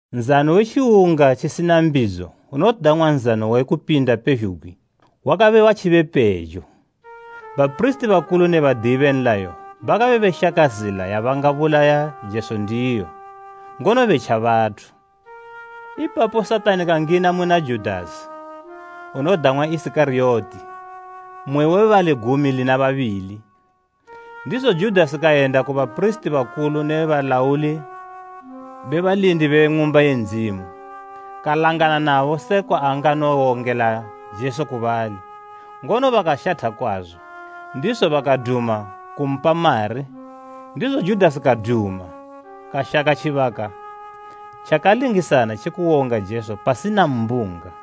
Nzano we Tjiwunga tjisina Mbidzo unodang'wa Nzano we Kupinda pezhugwi, wakabe watjibo pejo. Bapirisiti bakulu ne badiyi be nlayo bakabe beshaka zila yabangabulaya Jesu ndiyo, ngono betja bathu. Ipapo Satani kangina muna Judasi, unodang'wa Isikariyoti, mmwe we bali gumi lina babili. Ndizo Judasi kayenda ku bapirisiti bakulu ne balauli be balindi be Ng'umba ye Ndzimu, kalangana nabo sekwa angawongela Jesu ku bali. Ngono bakashatha kwazo, ndizo bakaduma kumpa mari ndizo Judasi kaduma, kashaka tjibaka tjakalingisana tje kuwonga Jesu pasina mbunga.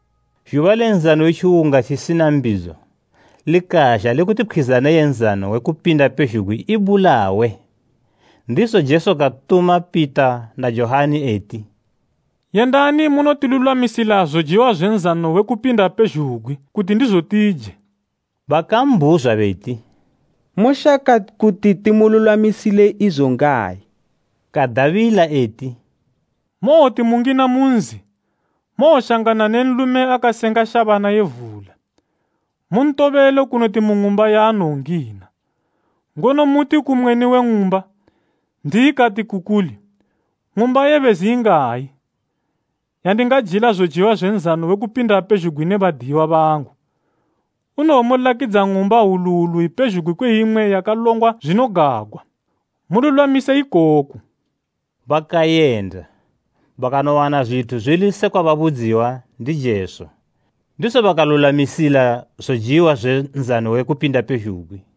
Zhuba le Tjiwunga tjisina Mbidzo, likazha lekuti pkhwizana ye Nzano we Kupinda pezhugwi ibulawe. Ndizo Jesu katuma Pita na Johani eti, “Yendani munotilulwamisila zojiwa zwe Nzano we Kupinda pezhugwi, kuti ndizo tije.” Bakambhuzwa beti, “Moshaka kuti timululwamisile izo ngayi?” Kadabila eti, “Mowoti mungina mu nzi, mowoshangana ne nlume akasenga shabana ye vula. Muntobele kunoti mu ng'umba yaanowongina, ngono muti ku mweni we ng'umba, ‘N'diyi kati ku kuli, ng'umba ye bezi ingayi, yandingajila zojiwa zwe nzano wekupinda pezhugwi ne badiyiwa bangu?’ Unowomulakidza ng'umba hwulu hwulu ipezhugwi kwe imwe yakalongwa zwinogagwa. Mululwamise ikoku.” Bakayenda, bakanowana zwithu zwili sekwa babudziwa ndi Jesu. Ndizo bakalulwamisila zojiwa zwe Nzano we Kupinda pezhugwi.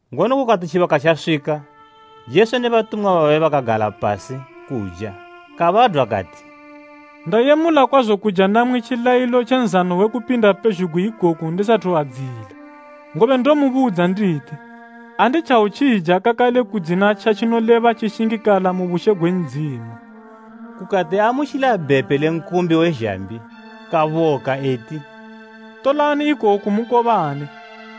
Ngono kukati tjibaka tjaswika, Jesu ne batumwa babe bakagala pasi kuja, Kabadwa kati, “Ndayemula kwazo kuja namwi tjilayilo tje Nzano we Kupinda pezhugwi ikoku ndisathu adziyila. Ngobe ndomubudza nditi, anditjawotjija kakale kudzina tjatjinoleba tjishingakala mu bushe gwe Ndzimu.” Kukati aamutjila bhepe le nkumbi we zhambi, kaboka eti, “Tolani ikoku mukobane.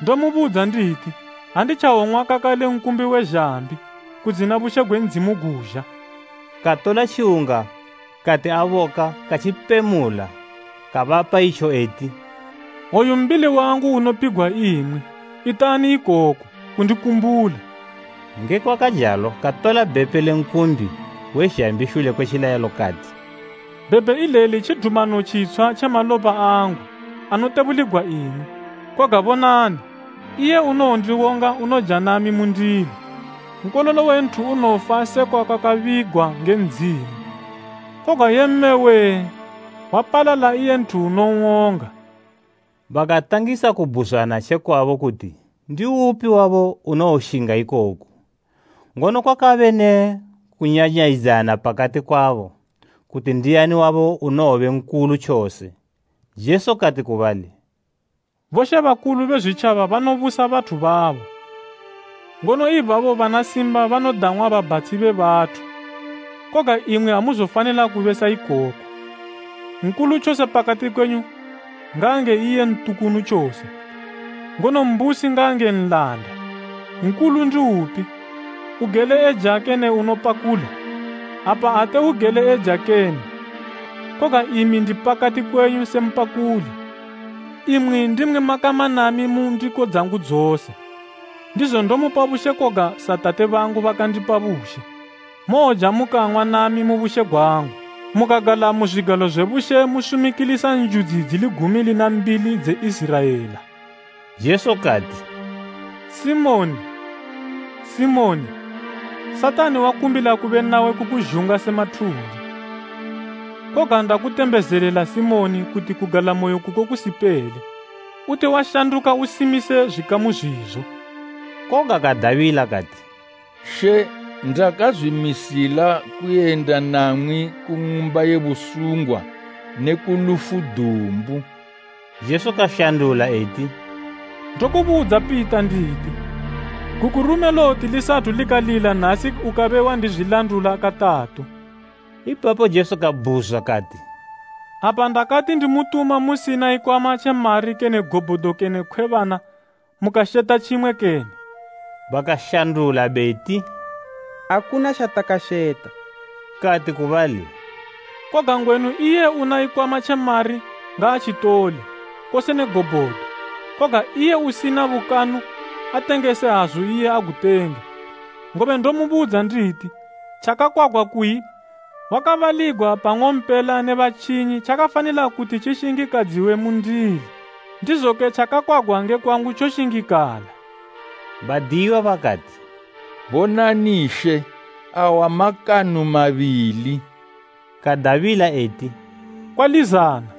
Ndomubudza nditi, anditjawong'wa kakale nkumbi we zhambi, kudzina bushe gwe Ndzimu guzha.” Katola tjiwunga kati aboka, katjipemula kabapa itjo eti, “Oyu mbili wangu unopigwa imwi. Itani ikoko, kundikumbula.” Ngekwakajalo katola bhepe le nkumbi we zhambi shule kwe tjilayilo kati, “Bhepe ileli tjidumano tjitshwa tje malopa angu, anotebuligwa imwi. “Koga bonani, iye unowondiwonga unoja nami mu ndilo. Nkololo we Nthu unowofa sekwa kwakabigwa nge Ndzimu, koga yee mme wee! Wapalala iye nthu unon'wonga!” Bakatangisa kubhuzwana tjekwabo kuti ndi upi wabo unowoshinga ikoku. Ngono kwakabe ne kunyanyayidzana pakati kwabo, kuti ndiani wabo unowobe nkulu tjose. Jesu kati ku bali, “Bomambo be zwitjaba banobusa bathu babo, ngono ibabo bana simba banodang'wa ‘Babhatshi be bathu.’ Koga imwi amuzofanila kube sa ikoko. Nkulu tjose pakati kwenyu ngaange iye ntukunu tjose, ngono mbusi ngaange nlanda. Nkulu ndiupi, ugele eja kene unopakula? Apa ate ugele eja kene? Koga imi ndi pakati kwenyu se mpakuli. “Imwi ndimwi makama nami mu ndiko dzangu dzose. Ndizo ndomupa bushe koga sa Tate bangu bakandipa bushe, mowoja mukang'wa nami mu bushe gwangu, mukagala mu zwigalo zwe bushe musumikilisa njudzi dzili gumi lina mbili dze Iziraela.” Jesu kati, “Simoni, Simoni, Satani wakumbila kube nawe kukuzhunga se mathunde. Koga ndakutembezelela Simoni kuti kugalamoyo kuko kusipele. Uti washanduka usimise zwikamu zwizo.” Koga kadabila kati, “She, ndakazwimisila kuyenda namwi ku ng'umba ye busungwa ne ku lufu dumbu.” Jesu kashandula eti, “Ndokubudza Pita, nditi, gukurume lowoti lisathu likalila nasi ukabe wandizwilandula katatu.” Ipapo Jesu kababhuzwa kati, “Apa ndakati ndimutuma musina ikwama tje mari kene gobhodo kene khwebana, mukasheta tjimwe kene?” Bakashandula beti, “Akuna tjatakasheta.” Kati ku bali, “koga ngwenu iye una ikwama tje mari, ngaatjitole, kose ne gobhodo, koga iye usina bukanu, atengese hazu iye agutenge. Ngobe ndomubudza nditi tjakakwagwa kuyi, ‘wakabaligwa pa nng'ompela ne batjinyi’ tjakafanila kuti tji shingikadziwe mundili, ndizoke tjakakwagwa nge kwangu tjoshingikala.” Badiyiwa bakati, “Bonani She, awa makanu mabili.” Kadabila eti, “Kwalizana.”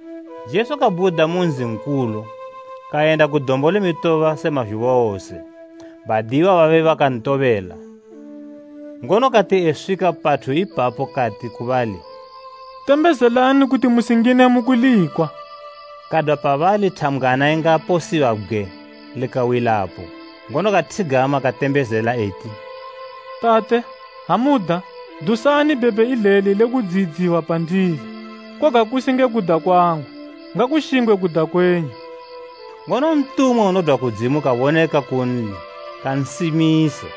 Jesu kabhuda mu nzi nkulu, kayenda ku Dombo le Mitoba se mazhuba wose, badiyiwa babe bakantobela. Ngono kati eswika pathu ipapo kati ku bali, “Tembezelani kuti musingine mu kulikwa.” Kadwa pabali thambgwana ingaposiwa bgwe likawilapo, ngono kathigama katembezela eti, “Tate, ha muda, dusani bhepe ileli le kudziyidziwa pandili, koga kusi nge kuda kwangu, ngakushingwe kuda kwenyu.” [ Ngono ntumwa unodwa kudzimu kaboneka kunli, kansimisa.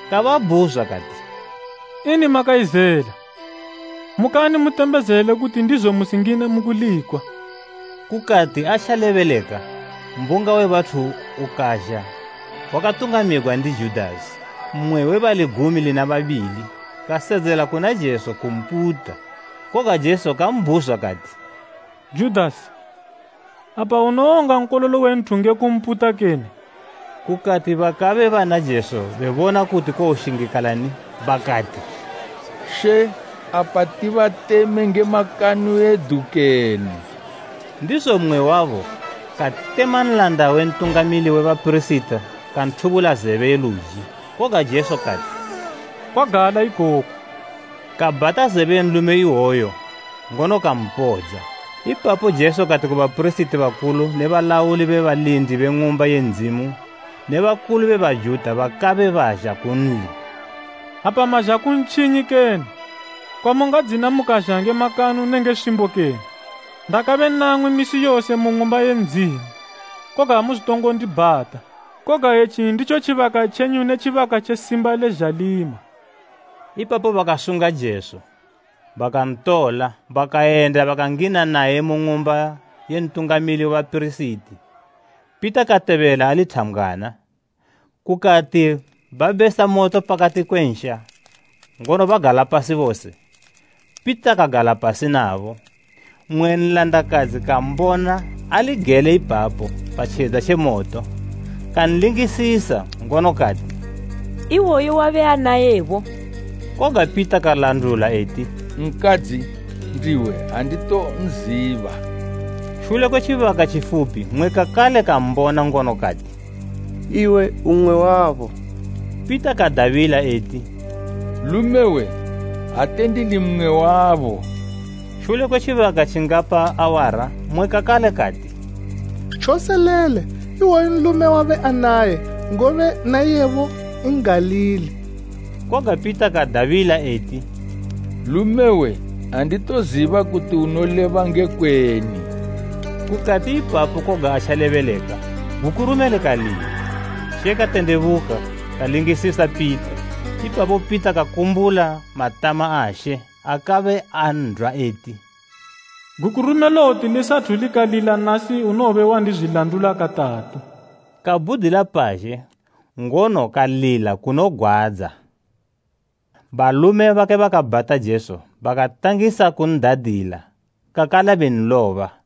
Kababhuzwa kati, “Ini makayizela? Mukani mutembezele kuti ndizo musingine mu kulikwa.” Kukati, atjalebeleka, mbunga we bathu ukazha wakatungamigwa ndi Judasi, mmwe we bali gumi lina babili. Kasedzela kuna Jesu kumputa. Koga Jesu kambhuzwa kati, “Judasi, apa unowonga Nkololo we Nthu nge kumputa kene?” Kukati bakabe bana Jesu bebona kuti kowoshingikalani bakati, “She, apa tibateme nge makanu edu kene?” Ndizo mmwe wabo katema nlanda we Ntungamili we bapirisiti kanthubula zebe ye luji. Koga Jesu kati, “Kwagala ikoku!” Kabhata zebe ye nlume ihwoyo ngono kampodza. Ipapo Jesu kati ku bapirisiti bakulu ne balauli be balindi be Ng'umba ye Ndzimu ne bakulu be Bajuta bakabe bazha kunli, “Apa mazha ku ntjinyi kene, kwamungadzina mukazha nge makanu nenge swimbo kene? Ndakabe namwi misi yose mu Ng'umba ye Ndzimu, koga amuzotongo ndibhata. Koga etji nditjo tjibaka tjenyu ne tjibaka tje simba le zhalima.” Ipapo bakasunga Jesu, bakantola, bakayenda bakangina naye mu ng'umba ye Ntungamili we bapirisiti. Pita katobela ali thambgwana. Kukati babesa moto pakati kwe nsha, ngono bagala pasi bose, Pita kagala pasi nabo. Mmwe nlandakadzi kambona ali gele ipapo pa tjedza tje moto. Kanlingisisa ngono kati, “Ihwoyu wabe anayebo.” Koga Pita kalandula eti, “Nkadzi, ndiwe anditonziba.” Shule kwe tjibaka tjifupi mmwe kakale kambona ngono kati, “Iwe umwe wabo.” Pita kadabila eti, “Lumewe, ate ndili mmwe wabo.” Shule kwe tjibaka tjingapa awara mmwe kakale kati, “Tjoselele iwoyu nlume wabe anaye, ngobe na iyebo N'galili.” Koga Pita kadabila eti, “Lumewe, anditoziba kuti unoleba ngekweni!” Kukati ipapo koga atjalebeleka, gukurume likalila. She katendebuka kalingisisa Pita. Ipapo Pita kakumbula matama a She akabe andwa eti, “Gukurume lowoti lisathu likalila nasi unowobe wandizwiladula katatu.” Kabhudila pazhe, ngono kalila kunogwadza. Balume bakabe bakabhata Jesu bakatangisa kun'dadila kakale benloba.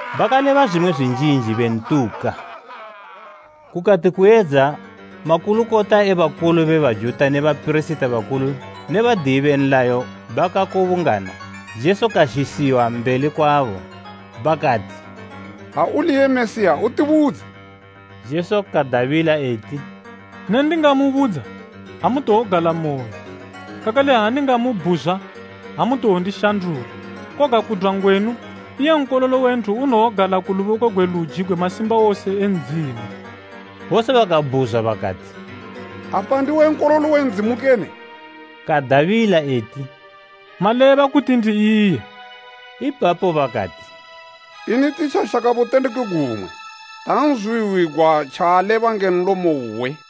Bakaleba zwimwe zwinjinji bentuka. Kukati kuyedza makulukota e bakulu be Bajuta ne bapirisiti bakulu ne badiyi be nlayo bakakubungana, Jesu kazhisiwa mbeli kwabo. Bakati, “Ha uli iye Mesiya utibudze.” Jesu kadabila eti, “Ne ndingamubudza, amutowogalamoyo, kakale ha ndingamubhuzwa amutowondishandula. Koga kudwa ngwenu, iye Nkololo we Nthu unowogala ku luboko gwe luji gwe Masimbawose e Ndzimu.” Bose bakabhuzwa bakati, “Apa ndiwe Nkololo we Ndzimu kene?” Kadabila eti, “Maleba kuti ndi iye.” Ipapo bakati, “Ini titjashaka butendeki gumwe? Tanzwihwigwa tjaaleba nge nlomo uwe.”